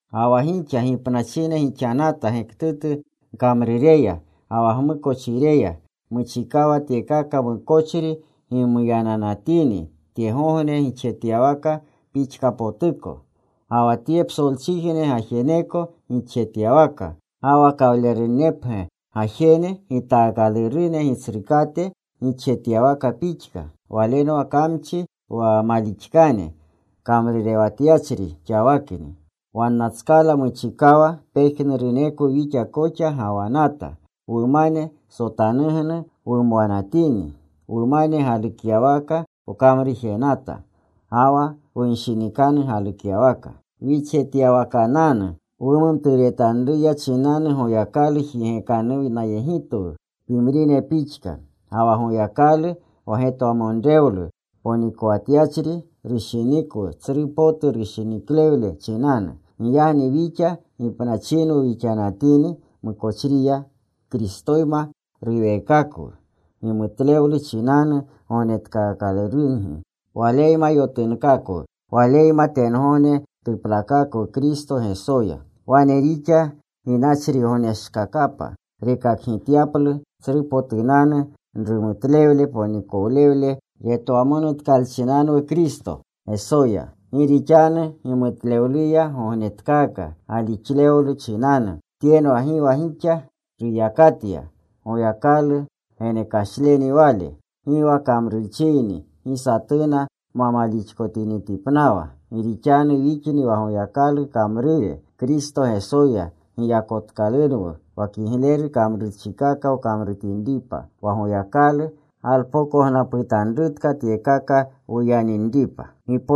Ga wa gixa gipnachine gixanata gektutu gkamrureya ga wa gmukochireya. Muchikawa tyekaka mukochri gimuyananatini tyegogne gixjetyawaka pixkapotuko, ga wa tye psolchijne gajeneko gixjetyawaka. Ga wa kawlerunnipgya gajene gitaakalurune gitsrukate gixjetyawaka pixka. Walenwa Kamchi wa malixkane kamrurewatyachri xawakni. Wannatskala muchikawa pejnurunekwu wixa koxa gawanata. Wumane sotanugnu wumwanatini. Wumane galukyawaka wkamrujenata ga wa wunshinikanu galukyawaka. Wixjetyawakananu wumumturetanruya chinanu Goyakalu jigekanuwnayegitwu pimrine pixka. Ga wa Goyakalu, wa getwamonrewlu ponikowatyachri, rushinikwu tsru potu rushiniklewle chinanu. Giyagni wixa gipnachinwu wixanatini mukochriya, Kristoyma ruweekakwu. Gimutlewlu chinanu gognetkaakalurungi. Waleyma yotunkakwu. Waleyma tengogne tuplakakwu Kristo Gesoya. Wane rixa ginachrigogneshkakapa rekakgityaplu tsrupotunanu rumutlewle ponikolewle retwamonutkalchinanwu Kristo Gesoya. Gi rixanu gimutlewluya gognetkaaka galixlewlu chinanu. Tyenwa gi wa gixa ruyakatya. Goyakalu genekashleni wale. Gi wa kamrurchiyni gi satuna ma malixkotinitipnawa. Gi rixanu wixni wa Goyakalu kamrure. Kristo Gesoya giyakotkalurunwu wa kigleru kamrurchikaka wkamrutinripa. Wa Goyakalu galpokognaputanrutka tyekaka wuyaninripa.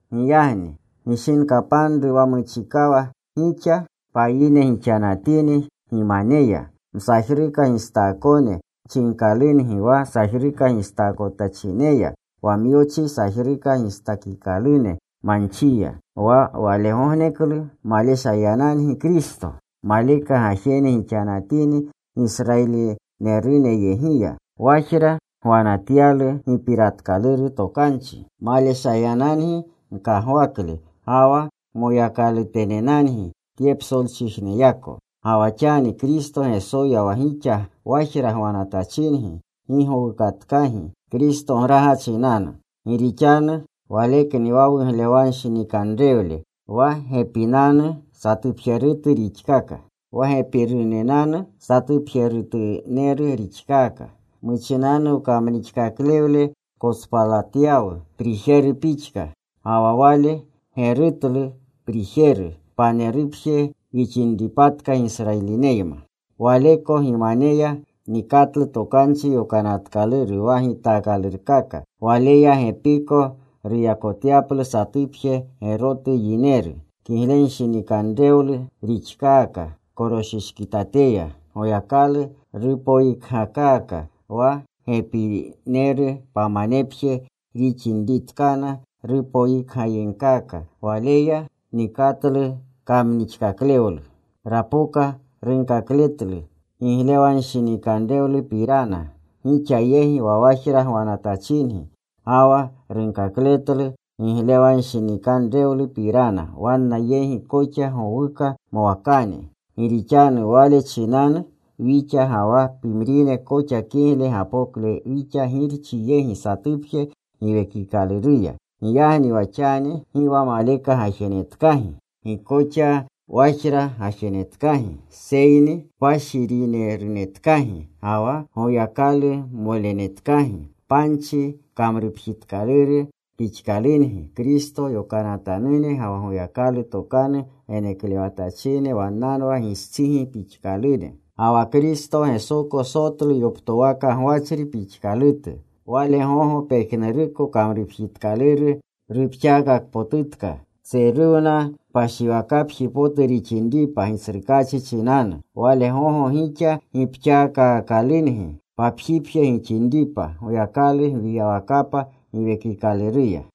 Giyagni gishinkapanru wa muchikawa gixa payine gixanatini gimaneya. Msajruka gistaakone chinkalungi wa sajruka gistaakotachineya wa myochi sajruka gistakikalune manchiya. Wa walegogneklu maleshayanangi Kristo. Maleka gajene gixanatini Gisrayilineruneyegiya. Wajra gwanatyalu gipiratkaluru tokanchi. Maleshayanangi gkagwakle. Ga wa moyakalutenenangi tye psolchijneyako. Ga wa xani Kristo Gesoya wa gixa wajra gwanatachingi gi gowukatkagi Kristograga chinanu. Gi rixanu Walekni wa wuglewanshinikanrewle. Wa gepinanu satupjerutu rixkaka. Wa gepinerunanu satupjerutuneru rixkaka. Muchinanu wkamnixkaklewle kotspalatyawu prijeru pixka. Ga wa wale gerutlu prijeru, panerupje wixinripatka Gisrayilineyma. Waleko gimaneya nikatlu Tokanchi Yokanatkaluru wa gitaakalurkaka. Waleya gepiko ruyakotyaplu satupje gerotu yineru. Kiglenshinikanrewlu rixkaka. Koroshishkitateya Goyakalu rupoyikgakaka. Wa gepineru pamanepje rixinritkana rupoyikgayegkaka. Walaya nikatlu kamnixkaklewlu. Rapoka. Runkakletlu giglewanshinikanrewlupirana gixa yegi wa wajra gwanatachingi, ga wa runkakletlu giglewanshinikanrewlupirana wanna yegi koxa gowuka mwakane. Gi rixanu Wale chinanu wixa ga wa pimrine koxa kigle gapokle wixa Girchi yegi satupje Giwekikaluruya. Giyagni wa xani gi wa maleka gajenetkagi. Gi koxa wajra gajenetkagi, seyni kpashirinenerunetkagi, ga wa Goyakalumolenetkagi. Panchi kamrupjitkaluru pixkalungi. Kristo yokanatanune ga wa Goyakalu tokanu geneklewatachine wannanwa gistsigi pixkalune. Ga wa Kristo Gesoko sotlu yoptowaka gwachri pixkalutu. Wale gogo pejnuruko kamrupjitkaluru rupxaakakpotutka. Tseruwna kpashiripji potu rixinripa Gitsrukaachi chinanu. Wale gogo gixa gipxaakaakalungi papjipje gixinripa Goyakalu gwiyawakapa Giwekikaluruya.